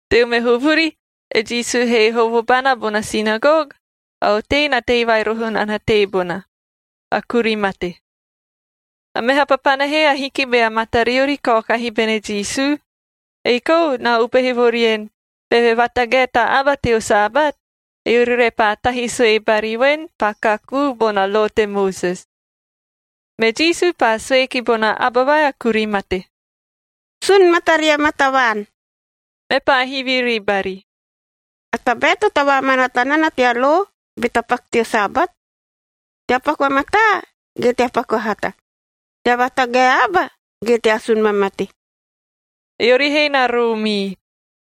Teo meho vuri, e Jisu he hovo bana bona sinagog, a otei na tei vai roho nana teebona, a kuri mate. A meha papana he ahiki bea matariori kaokahi bene Jisu. Ei kou na upehe vo rien, beve vatagae ta aba teo Sabat, eori repaa tahi sue bari voen, paa kakuu bona lo te Moses. Me Jisu paa sue ki bona aba vai a kuri mate, “Sun mataria maa tavaan.” Mepaa hivi ribari, “A tabae to tavaamanaata nana tea lo be tapaku teo Sabat? Tea paku a mataa ge tea paku a hata? Tea vatagae a aba ge tea asun vamate?” Eori he na roomii.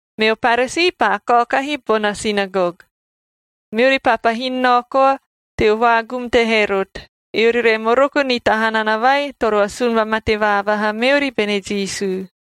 Meo Paresii paa kaokahi bona sinagog, meori paa pahin nao koa teo vaagum te Herot,a eori re moroko ni ta hanana vai toro asun vamate vaavaha meori bene Jisu.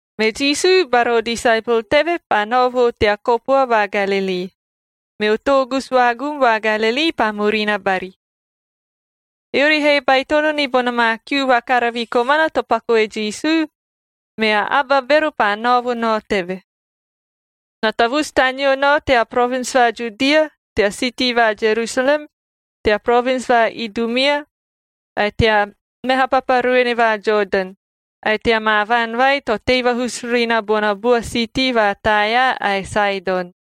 Me Jisu bara o disaepol teve paa nao vo tea kopua va Galilii, meo toogusu vaagum va Galilii paa murina bari. Eori he baitono ni bona maa kiu vakaravi komana to paku e Jisu, mea aba bero paa nao vo nao teve. Na tavusu taneo nao tea provins va Judia, tea siitii va Jerusalem, tea provins va Idumia, ae tea meha papa ruene va Jodan, ae tea maa vaan vai to tei vahusu ri na bona bua siitii va Taea ae Saedon.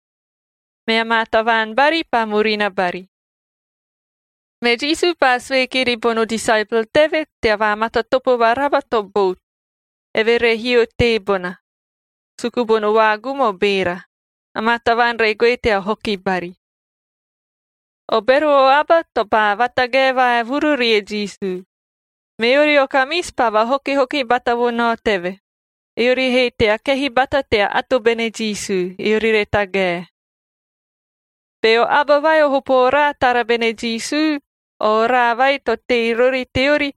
Mea maa tavaan bari paa murina bari. Me Jisu paa sue kiri bono disaepol teve tea vaamatatopo varaba to bout, eve re hio teebona, suku bono vaagum o beera. Amaa tavaan re goe tea hoki bari. O bero o aba to paa vatagae vaevuru rie Jisu. Meori o kamisi paa vahokihoki bata vo nao teve, eori he tea kehi bata tea ato bene Jisu, eori re tagae. Beo aba vai o hopo oraa tara bene Jisu, o oraa vai to tei rori teori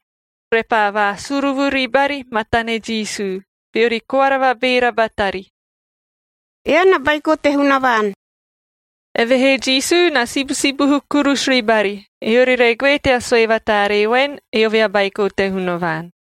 repaa vaasuruvu ribari matane Jisu, beori koara vabeera batari, “Ean a Baiko te Hunavaan!” Evehee Jisu na sibusibuhu kurusu ribari, eori re goe tea sue vataaree voen, eove a Baiko te Hunavaan.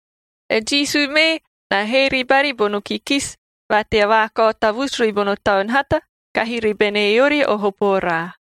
E Jisu mee na hee ribari bono kikisi va tea vaakao tavusu ribono taun hata kahi ribene eori o hopo oraa.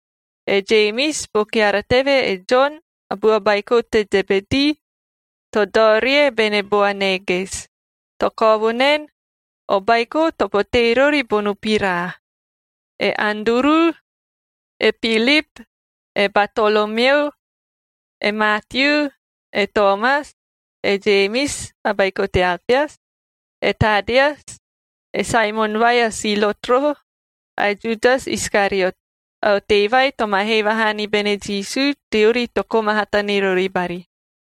e Jemis, bo keara teve e Jon, a bua baiko te Zebedii (to dao rie bene Boaneges, to kao vo naen, o baiko to potee rori bono piraa), e Anduru, e Pilip, e Batolomeo, e Maatiu, e Toomas, e Jemis (a baiko te Alpeas), e Tadeas, e Saemon vai a Silotc roho, ae Judas Iskariot, a otei vai to ma hee vahaa ni bene Jisu teori to koma hata ni rori bari.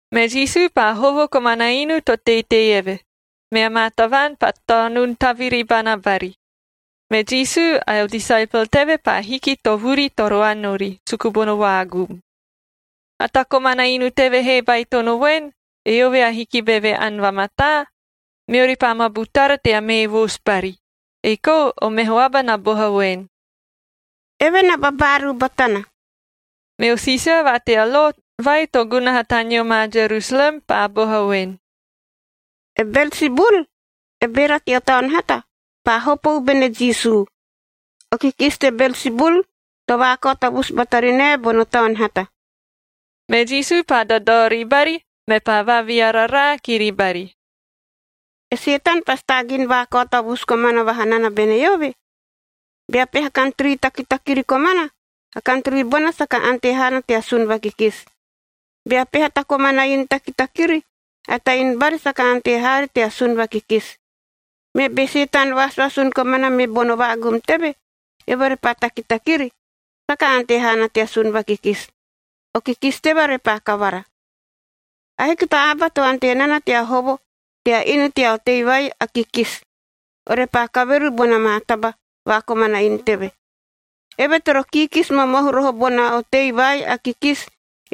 Me Jisu paa hovo komana inu to teitei eve, mea maa tavaan paa taonun taviri bana bari, me Jisu ae o disaepol teve paa hiki to vuri toro ani ori, suku bono vaagum. A ta komana inu teve he baitono voen, eove ahiki beve ani vamataa, meori paa ma butara tea mee voosu bari, ei kou o meho aba na boha voen, “Eve na babaaruu batana.” Meo siisia va tea lo vai to gunaha taneo ma Jerusalem paa boha voen, “E Belsibul,d e beera teo taun hata, paa hopou bene Jisu. O kikisi te Belsibul to vaakao tavusu bata ri nae bono taun hata.” Me Jisu paa dadao ribari, mepaa vaaviararaa kiri bari, “E Setan pasi taagin vaakao tavusu komana vaha nana bene eove? Bea peha kantri takitakiri komana, a kantri bona saka ante haana tea sun vakikisi. Bea peha ta komana inu takitakiri, a ta inu bari saka ante haari tea sun vakikisi. Me be Setan vaasuasun komana me bono vaagum teve, eove repaa takitakiri, saka ante haana tea sun vakikisi. O kikisi teve repaa kavara. “Ahiki ta aba to ante nana tea hovo tea inu tea otei vai a kikisi, orepaa kaveru bona maa taba va komana inu teve. Eve toro kiikisi momohu roho bona a otei vai a kikisi,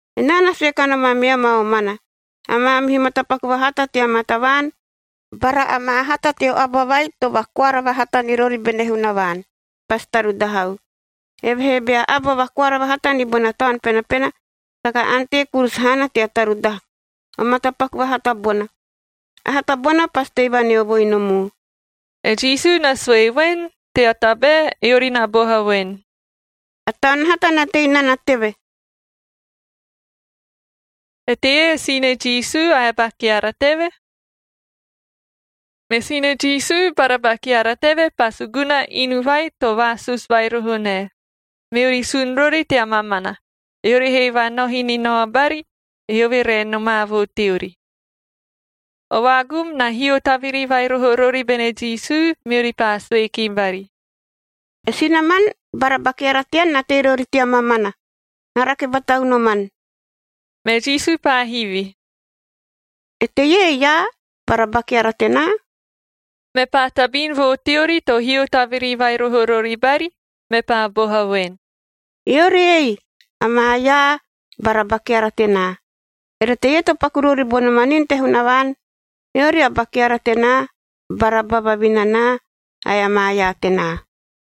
“Enaa na sue kanom ameam a omana, a maamihu matapaku vahata tea maa tavaan, bara amaa hata teo aba vai to vakoara vahata ni rori bene Hunavaan, pasi tarudahau. Evehee bea aba vakoara vahata ni bona Taun Penapena, saka ante kurusu haana tea tarudaha o matapaku vahata bona. A hata bona pasi tei vaneovoi nom u.” E Jisu na sue voen, tea tabae eori na boha voen, “A taun hata na tei nana teve.” Eteie e sine Jisu ae a ba keara teve? Me sine Jisu bara ba keara teve paa suguna inu vai to vaasusu vai roho nae, meori sun rori tea mamana, eori he vaanohi ni nao bari, eove re nomaa vo teori. O vaagum na hio taviri vai roho rori bene Jisu, meori paa sue ki bari, “E sinaman bara ba keara tean na tei rori tea mamana, na rake bata unoman.” Me Jisu paa hivi, “Eteie e iaa bara ba keara tenaa?” Mepaa tabin vo teori to hio taviri vai roho rori bari, mepaa boha voen, “Eori ei, amaa iaa bara ba keara tenaa! Ere teie to paku rori bono manin te Hunavaan, eori a ba keara tenaa bara ba vavinanaa ae amaa iaa tenaa.”